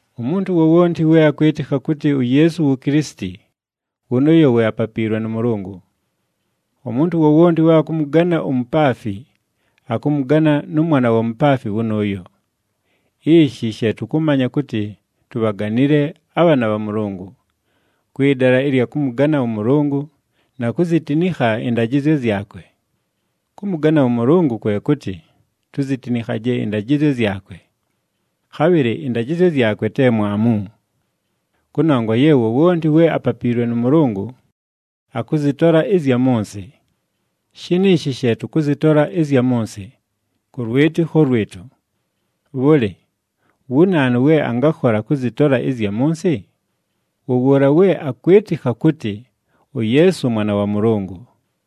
Umuntu wowonti we akwɨtɨkha kʉtɨ uYeesu wu Kilisiti, wʉnʉʉyo we apapiilwe nʉ Mʉlʉngʉ. Umuntu wowonti we akʉmʉgana umupaafi, akʉmʉgana nʉ mwana wa mupaafi wʉnʉʉyo. Ishi she tʉkʉmanya kʉtɨ tubhaganile abhaana bha Mʉlʉngʉ: kwɨ dala ɨlya kʉmʉgana ʉMʉlʉngʉ, na kuzitinikha ɨndajɨzyo zyakwe. Kʉmʉgana ʉMʉlʉngʉ kwe kʉtɨ, tuzitinikhaje ɨndajɨzyo zyakwe. Khabhɨlɨ ɨndajɨzyo zyakwe te mwamu. Kʉnongwa ye wowonti we apapiilwe nʉ Mʉlʉngʉ, akʉzɨtola ɨzya mʉ nsɨ. Shiniishi she tʉkʉzɨtola ɨzya mʉ nsɨ: kʉ lwɨtɨkho lwɨtʉ. Bhʉlɨ! Wu naanu we angakhola kʉzɨtola ɨzya mʉ nsɨ? Wʉ wʉʉla we akwɨtɨkha kʉtɨ uYeesu Mwana wa Mʉlʉngʉ.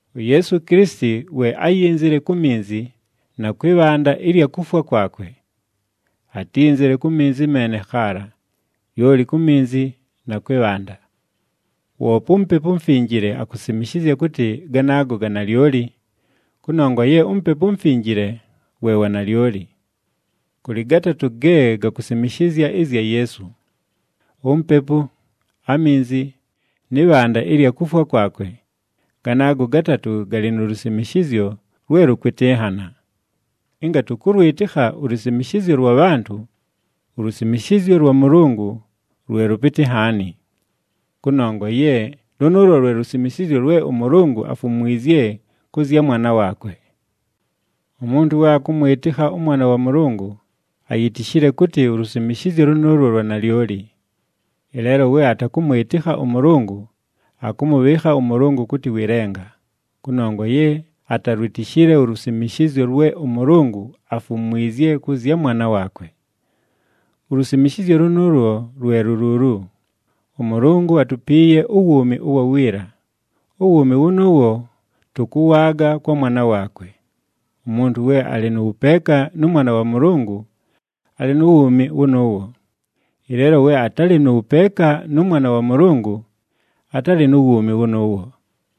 UYeesu Kilisiti we áyinzile ku minzi, na kwɨ bhanda ɨlya kufwa kwakwe. Atínzile ku minzi meene khaala, lyoli ku minzi na kwɨ bhanda. Woope uMupepu uMufinjile akusimishizya kʉtɨ ganaago ga nalyoli, kʉnongwa ye uMupepu uMufinjile we wanalyoli. Kʉlɨ gatatʉ ge gakusimishizya ɨzya Yeesu: uMupepu, aminzi, nɨ bhanda ɨlya kufwa kwakwe, ganaago gatatʉ galɨ nu lusimishizyo lwe lʉkwɨtɨnhana. Ɨnga tʉkʉlwɨtɨkha ulusimishizyo lwa bhantʉ, ulusimishizyo lwa Mʉlʉngʉ lwe lʉpɨtɨ nhaani. Kʉnongwa ye lʉnʉʉlwo lwe lusimishizyo lwe ʉMʉlʉngʉ afumwizye kʉ zya Mwana waakwe. Umuntu we akʉmwɨtɨkha ʉMwana wa Mʉlʉngʉ, ayitishile kʉtɨ ulusimishizyo lʉnʉʉlwo lwa nalyoli. Ɨleelo we atakʉmwɨtɨkha ʉMʉlʉngʉ, akʉmʉbhɨɨkha ʉMʉlʉngʉ kʉtɨ wɨ lenga, kʉnongwa ye atalwitishile ulusimishizyo lwe ʉMʉlʉngʉ afumwizye kʉ zya Mwana waakwe. Ulusimishizyo lʉnʉʉlwo lwe lu luulu: ʉMʉlʉngʉ atupiiye uwuumi ʉwa wiila, uwuumi wʉnʉʉwo tʉkʉwaaga kwa Mwana waakwe. Umuntu we alɨ nʉ wʉpeeka nʉ Mwana wa Mʉlʉngʉ, alɨ nu wuumi wʉnʉʉwo. Ɨleelo we atalɨ nʉ wʉpeeka nʉ Mwana wa Mʉlʉngʉ, atalɨ nu wuumi wʉnʉʉwo.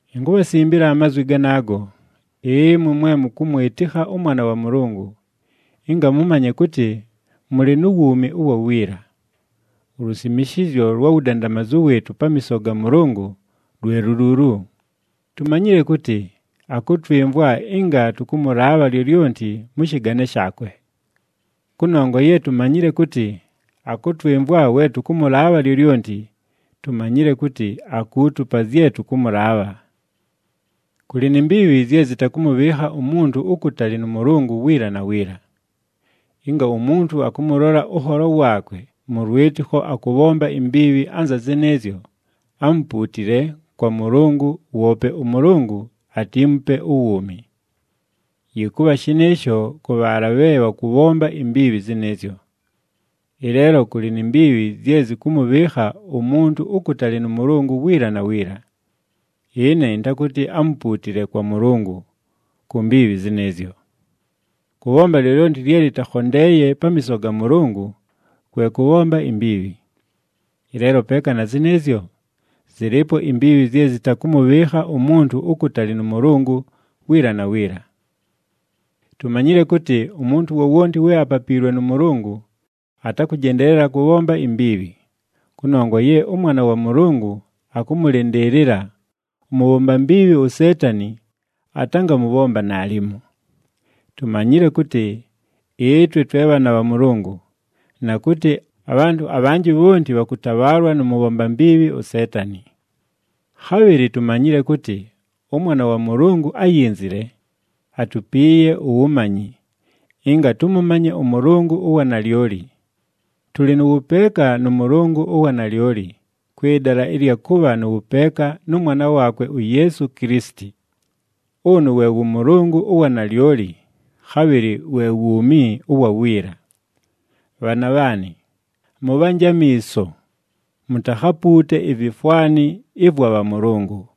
Inkubhasimbila amazwi ganaago, ɨmwe mwe mʉkʉmwɨtɨkha ʉMwana wa Mʉlʉngʉ, ɨnga mʉmanye kʉtɨ mʉlɨ nu wuumi ʉwa wiila. Ulusimishizyo lwa wudandamazu wɨɨtʉ pamiiso ga Mʉlʉngʉ lwe lu luulu: tumanyile kʉtɨ akʉtwɨmvwa ɨnga tʉkʉmʉlaabha lyolyonti mʉ shɨgane shaakwe. Kʉnongwa ye tumanyile kʉtɨ akʉtwɨmvwa we tʉkʉmʉlaabha lyolyonti, tumanyile kʉtɨ akuutupa zye tʉkʉmʉlaabha. Kʉlɨ ni mbiibhi zye zɨtakʉmʉbhɨɨkha umuntu ukutali nʉ Mʉlʉngʉ wiila na wiila. Ɨnga umuntu akʉmʉlola ʉnholo waakwe mʉ lwɨtɨkho akʉbhomba imbiibhi anza zɨnɨɨzyo, amupuutile kwa Mʉlʉngʉ, woope ʉMʉlʉngʉ atiimupe uwuumi. Yɨkʉbha shɨnɨɨsho kʉ bhaala bhe bhakʉbhomba imbiibhi zɨnɨɨzyo. Ɨleelo kʉlɨ ni mbiibhi zye zɨkʉmʉbhɨɨkha umuntu ukutali nʉ Mʉlʉngʉ wiila na wiila. Ɨne ɨntakʉtɨ amupuutile kwa Mʉlʉngʉ ku mbiibhi zɨnɨɨzyo. Kʉbhomba lyolyonti lye lɨtakhondeeye pamiiso ga Mʉlʉngʉ, kwe kʉbhomba imbiibhi. Ɨleelo peeka na zɨnɨɨzyo, zɨlɨɨpo imbiibhi zye zɨtakʉmʉbhɨɨkha umuntu ukutali nʉ Mʉlʉngʉ wiila na wiila. Tumanyile kʉtɨ umuntu wowonti we apapiilwe nʉ Mʉlʉngʉ, atakʉjendeelela kʉbhomba imbiibhi, kʉnongwa ye ʉMwana wa Mʉlʉngʉ akʉmʉlɨndɨɨlɨla, ʉmʉbhomba mbiibhi uSeetani atangamʉbhomba naalimo. Tumanyile kʉtɨ ɨtwe twe bhaana bha Mʉlʉngʉ, na kʉtɨ abhantʉ abhanjɨ bhonti bhakʉtabhaalwa nʉ mʉbhomba mbiibhi uSeetani. Khabhɨlɨ tumanyile kʉtɨ ʉMwana wa Mʉlʉngʉ áyinzile, atupiiye uwumanyi, ɨnga tʉmʉmanye ʉMʉlʉngʉ ʉwa nalyoli. Tʉlɨ nʉ wʉpeeka nʉ Mʉlʉngʉ ʉwa nalyoli, kwɨ dala ɨlya kʉbha nʉ wʉpeeka nʉ Mwana waakwe uYeesu Kilisiti. Ʉnʉ we wʉ Mʉlʉngʉ ʉwa nalyoli, khabhɨlɨ we wuumi ʉwa wiila. Bhaana bhaanɨ, mʉbhanje amiiso, mutakhapuute ivifwani ɨvwa bhamʉlʉngʉ.